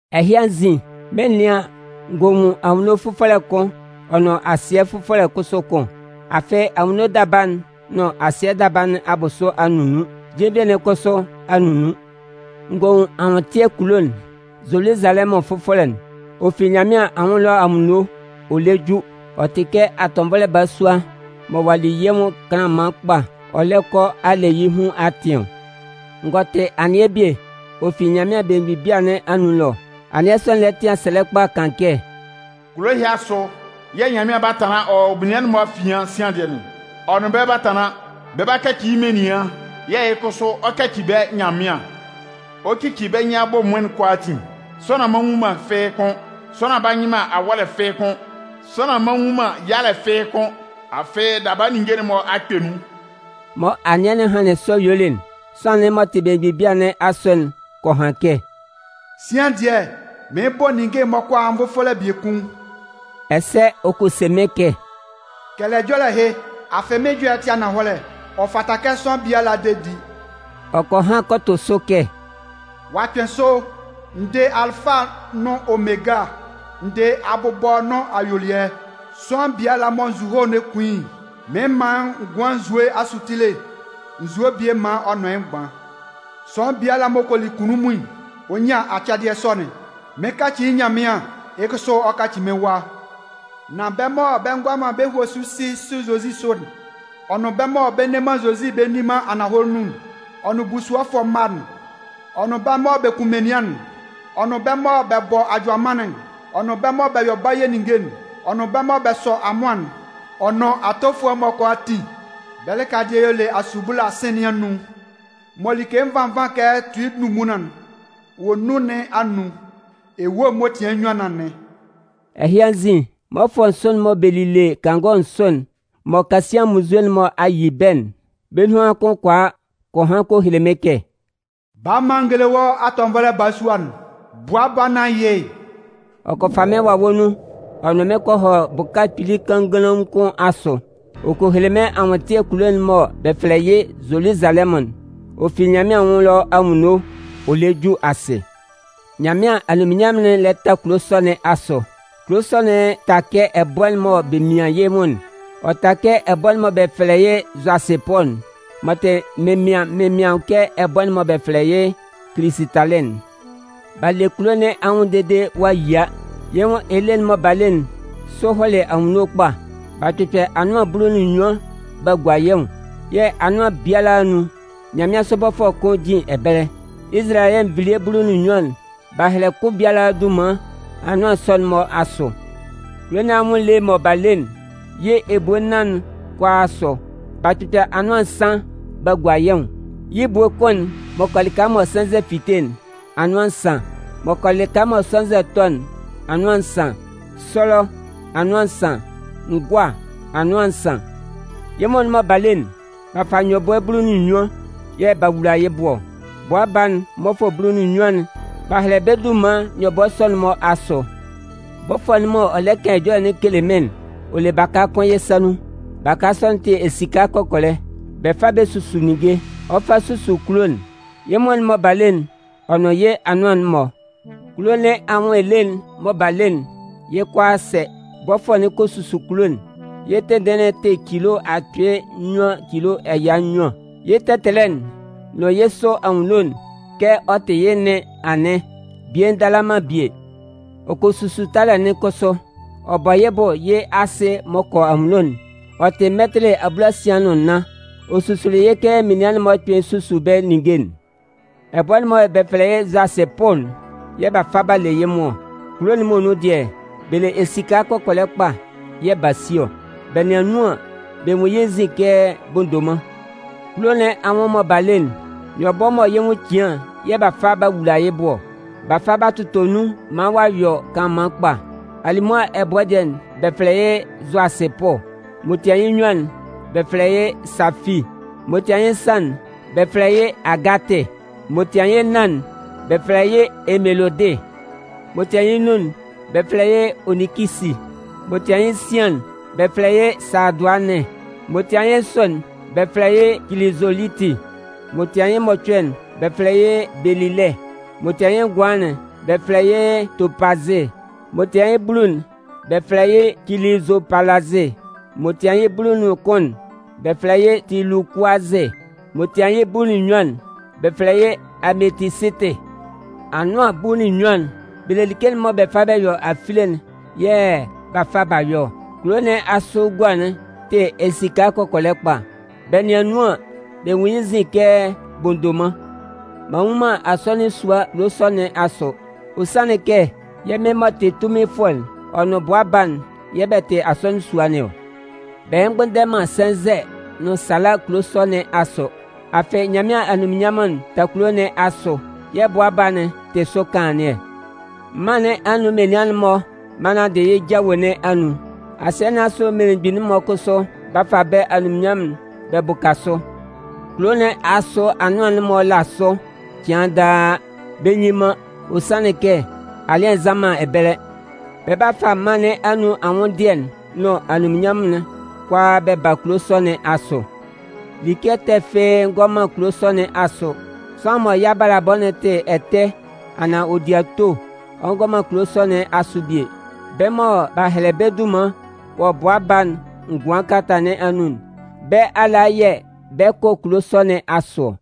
Ɛhɩ anzin, mɩn 'nɩan an, n gɔ nwun anwunno fʋfɔlɛ kʋn ɔ nʋn asɩɛ fʋfɔlɛ kʋsʋ kʋn. Afɩ anwunno daba'n nʋn asɩɛ daba nɩn abʋsʋ a nunnun. Jenvie'n kʋsʋ a nunnun. N gɔ nwun anwʋntɩɛ kulo'n, Zoluzalɛmʋn fʋfɔlɛ'n. Ɔ fi Nyanmɩan anwʋn ɛlɔ anwunno ɔ lɛ ju. Ɔ tɩ kɛ atɔnvɔlɛ balasua mɔ ɔ'a li yɩ́ nwʋn kanlanman kpa ɔ lɛ kɔ a le yɩ́ hun atɩn ɔ. N gɔ tɩ anɩɛ bie, ɔ fi Nyanmɩan belemgbin bia nɩn anun ɛlɔ. Anɩɛ sɔ'n lɛ tɩan sɛlɛ kpa kan kɛ: “Kulo ɛhɩ asʋ yɛ̂ Nyanmɩan 'ba tanlan wɔ menian'n-mɔ afian sian dɩɛ nɩn ɔ. Ɔ nʋn bɛ́ 'ba tanlan. Bɛ 'kaci yɩ́ menian, yɛ̂ yɩ́ kʋsʋ ɔ 'kaci bɛ́ Nyanmɩan. Ɔ 'cici bɛ́ nyɩn abʋ ɛmʋɩn'n kʋalaatin, sʋanlan mma nwu man fɩ́ɩ́ kʋ́n, sʋanlan mma nyɩ man awɔ́lɛ fɩ́ɩ́ kʋ́n, sʋanlan mma nwun man yalɛ fɩ́ɩ́ kʋ́n. Afɩ daba ninnge'n-mɔ a kpɛ nun.” Mɔ anɩɛ'n hanlɩn sɔ yuelɩ'n, sʋanlan'n m'ɔ tɩ belemgbin bia nɩn asʋ'n kɔ han kɛ: “Sian dɩɛ, mɩɩn bɔ ninnge'n-mɔ kʋalaa nvʋfɔlɛ biekun.” Ɛsɛ ɔ kɔ se mɩ́n kɛ: “Kɛlɛ ɛjɔlɛ ɛhɩ, afɩ mɩ́n ɛjɔlɛ'n tɩ ananhɔlɛ, ɔ fata kɛ sʋanlan biala de di.” Ɔ kɔ han kɔ tʋ sʋ kɛ: “Ɔ'a kpɩn sʋ! N dɩ Alɩfa nʋn Omega, n dɩ abʋbɔ nʋn ayuelɩɛ. Sʋanlan biala mɔ nzuhoe lɛ kun yɩ́'n, mɩn 'man yɩ́ ngʋan asutile nzue'n bie maan ɔ nʋn yɩ́ mgban. Sʋanlan biala m'ɔ kɔ li kunnunmun'n, ɔ 'nyan acɛdɩɛ sɔ'n. Mɩn 'kaci yɩ́ Nyanmɩan, yɩ́ kʋsʋ ɔ 'kaci mɩ́n wa. Nan bɛ́ mɔ bɛ ngʋala man bɛ́ hue si si Zozi sʋ'n, ɔ nʋn bɛ́ mɔ bɛ nne man Zozi bɛ nni man ananhɔlɛ nun'n, ɔ nʋn busuɔfʋɛ mma'n, ɔ nʋn bɛ́ mɔ bɛ kun menian'n, ɔ nʋn bɛ́ mɔ bɛ bɔ ajʋamannɩn'n, ɔ nʋn bɛ́ mɔ bɛ yɔ baye ninnge'n, ɔ nʋn bɛ́ mɔ bɛ sɔ amʋan'n, ɔ nʋn atofʋɛ'n-mɔ kʋalaatin, bɛ́ lɩka dɩɛ y'ɔ le asubula sɩ̂n nɩn anun mɔ like nvan nvan kɛ tui ndunmunlan'n wɔ nun nɩn anun. Ewue m'ɔ tian yɩ́ nnyuan nɩn anɩn.” Ɛhɩ anzin, mmɔfʋɛ nsʋ'n mɔ bɛ lile kangɔ nsʋ'n mɔ kasian munnzue'n-mɔ a yi bɛ́'n, bɛ́ nunhan kʋn kɔ a kɔ han kɔ hele mɩ́n kɛ: “Bala maan n géle wɔ́ atɔnvɔlɛ balasua'n, Bʋa Baa nɩn ayɩ'n.” Ɔ kɔ fa mɩ́n wawɛ nun ɔ nʋn mɩ́n kɔ hɔ bʋka kpili kannganlaun kʋn asʋ. Ɔ kɔ hele mɩ́n anwʋntɩɛ kulo'n mɔ bɛ fɛlɛ yɩ́ Zoluzalɛmʋn'n. Ɔ fi Nyanmɩan anwʋn ɛlɔ anwunno ɔ lɛ ju asɩ. Nyanmɩan anunminnyanmʋn'n lɛ ta kulo sɔ nɩn asʋ. Kulo sɔ'n ta kɛ ɛbʋɛ'n mɔ bɛ mian yɩ́ nwʋn'n. Ɔ ta kɛ ɛbʋɛ'n mɔ bɛ fɛlɛ yɩ zʋasɩpʋ'n m'ɔ tɩ mɩnmɩan-mɩnmɩan kɛ ɛbʋɛ'n mɔ bɛ fɛlɛ yɩ́ kilisɩtalɩ'n. B'a le kulo nɩn anwʋn dede ɔ'a yia. Yɩ́ nwʋn ele'n mɔ b'a le'n, sʋ hɔlɩ anwunno kpa. B'a kpɩkpɛ anʋan bulu nʋn nnyuan b'a gua yɩ́ nwʋn. Yɛ̂ anʋan biala anun, nyanmɩansʋ bɔfʋɛ kʋn jin ɛbɛlɛ. Izalayɛ nvilie bulu nʋn nnyuan'n, b'a hɛlɛ kʋn biala dunman anʋan sɔ'n-mɔ asʋ. Kulo nɩn anwʋn ele mɔ b'a le'n, yɩ́ ebue nnan'n kʋalaa asʋ, b'a kpɩkpɛ anʋan nsan b'a gua yɩ́ nwʋn. Yɩ́ ebue kʋn'n m'ɔ kɔ lɩka mɔ sɛnzɛ'n fite'n: anʋan nsan. M'ɔ kɔ lɩka mɔ sɛnzɛ'n tɔ'n: anʋan nsan. Sɔlɔ: anʋan nsan. Ngʋa: anʋan nsan. Yɩ́ nwʋn'n mɔ b'a le'n, b'a fa nyɔbʋɛ bulu nʋn nnyuan yɛ̂ b'a wula yɩ́ bʋ ɔ. Bʋa baa'n mmɔfʋɛ bulu nʋn nnyuan'n, b'a hɛlɛ bɛ́ dunman nyɔbʋɛ sɔ'n-mɔ asʋ. Bɔfʋɛ'n m'ɔ lɛ kan ɛjɔlɛ'n kele mɩ́n'n, ɔ le baka kʋn yɩ́ sa nun. Baka sɔ'n tɩ esika kɔkɔlɛ. Bɛ fa bɛ susu ninnge. Ɔ 'fa susu kulo'n, yɩ́ nwʋn'n mɔ b'a le'n, ɔ nʋn yɩ́ anʋan'n-mɔ. Kulo nɩn anwʋn ele'n mɔ b'a le'n, yɩ́ kʋalaa sɛ. Bɔfʋɛ'n kɔ susu kulo'n, yɩ́ tɩnndɩɩn'n tɩ cilo akpɩɩ nnyuan cilo ɛya nnyuan, yɩ́ tɛtɛlɛ'n, nʋn yɩ́ sʋ anwunno'n kɛ ɔ tɩ yɩ́ nɩn anɩn, bie ndala man bie. Ɔ kɔ susu talɛ'n kʋsʋ. Ɔ bɔ yɩ́ bʋ yɩ́ asɩ m'ɔ kɔ anwunno'n, ɔ tɩ mɛtɩlɩ abulasian nʋn nnan. Ɔ susuli yɩ́ kɛ menian'n-mɔ kpɩn susu bɛ́ ninnge'n. Ɛbʋɛ'n mɔ bɛ fɛlɛ yɩ́ zʋasɩpʋ'n, yɛ̂ b'a fa b'a le yɩ́ nwʋn ɔ. Kulo'n muonun dɩɛ, bɛ le esika kɔkɔlɛ kpa yɛ̂ b'a si ɔ. Bɛ nɩan nun an, bɛ nwun yɩ́ nzin kɛ bondoman. Kulo nɩn anwʋn mɔ b'a le'n, nyɔbʋɛ mɔ yɩ́ nwʋn cian yɛ̂ b'a fa b'a wula yɩ́ bʋ ɔ. B'a fa b'a tʋtɔ nun maan ɔ'a yɔ kanlanman kpa. Alimʋa ɛbʋɛ dɩɛ'n, bɛ fɛlɛ yɩ́ zʋasɩpʋ. M'ɔ tian yɩ́ nnyuan'n, bɛ fɛlɛ yɩ́ safii, m'ɔ tian yɩ́ nsan'n, bɛ́ fɛlɛ yɩ́ agatɩ, m'ɔ tian yɩ́ nnan'n, bɛ fɛlɛ yɩ́ emelodɩ, m'ɔ tian yɩ́ nnun'n, bɛ fɛlɛ yɩ́ oninkisi, m'ɔ tian yɩ́ nsian'n, bɛ fɛlɛ yɩ́ saadʋanɩn, m'ɔ tian yɩ́ nsʋ'n, bɛ fɛlɛ yɩ́ kilizoliti, m'ɔ tian yɩ́ mɔcʋɛ'n, bɛ fɛlɛ yɩ́ belilɩ, m'ɔ tian yɩ́ ngʋanlan'n, bɛ fɛlɛ yɩ́ topazɩ, m'ɔ tian yɩ́ bulu'n, bɛ fɛlɛ yɩ́ kilizopalazɩ, m'ɔ tian yɩ́ bulu nʋn kʋn'n, bɛ fɛlɛ yɩ́ tulukʋazɩ, m'ɔ tian yɩ́ bulu nʋn nnyuan'n, bɛ fɛlɛ yɩ́ ametisitɩ. Anʋan bulu nʋn nnyuan'n, bɛ le like'n mɔ bɛ fa bɛ yɔ afile'n, yɛ̂ b'a fa b'a yɔ ɔ. Kulo nɩn asʋ gua'n tɩ esika kɔkɔlɛ kpa, bɛ nɩan nun an, bɛ nwun yɩ́ nzin kɛ bondoman. M'an nnwun man asɔnɩn sua kulo sɔ nɩn asʋ. Ɔ sanlɩn kɛ yɛ́ Mɩn m'ɔ tɩ Tunminfʋɛ'n ɔ nʋn Bʋa baa'n yɛ̂ bɛ tɩ asɔnɩn sua nɩn ɔ. Bɛ mgbʋnndɛ man sɛnzɛ nʋn sala kulo sɔ nɩn asʋ. Afɩ Nyanmɩan anunminnyanmʋn'n ta kulo nɩn asʋ yɛ̂ Bʋa Baa'n tɩ sʋ kanlannɩɛ. Mân nɩn anun menian'n-mɔ 'ba nanndɩ yɩ́ jawe nɩn anun. Asɩɛ nɩn asʋ mmelemgbin'n-mɔ kʋsʋ 'ba fa bɛ́ anunminnyanmʋn'n bɛ bʋka sʋ. Kulo nɩn asʋ anʋan'n-mɔ la sʋ cɩan daa, bɛ nnyin man, ɔ sanlɩn kɛ alɩsan nnʋn man ɛbɛlɛ. Bɛ 'ba fa mân nɩn anun anwʋnndɩɛ'n nʋn anunminnyanmʋn'n kʋalaa bɛ ba kulo sɔ nɩn asʋ. Like ɛtɛ fɩ́ɩ́ ngɔ man kulo sɔ nɩn asʋ. Sʋanlan mɔ yɩ́ abalabɔ'n tɩ ɛtɛ anaan ɔ di ato'n, ɔ ngɔ man kulo sɔ nɩn asʋ bie. Bɛ́ mɔ b'a hɛlɛ bɛ́ dunman wɔ Bʋa Baa'n ngʋan kalata nɩn anun'n, bɛ́ ala yɛ̂ bɛ 'kɔ kulo sɔ nɩn asʋ ɔ.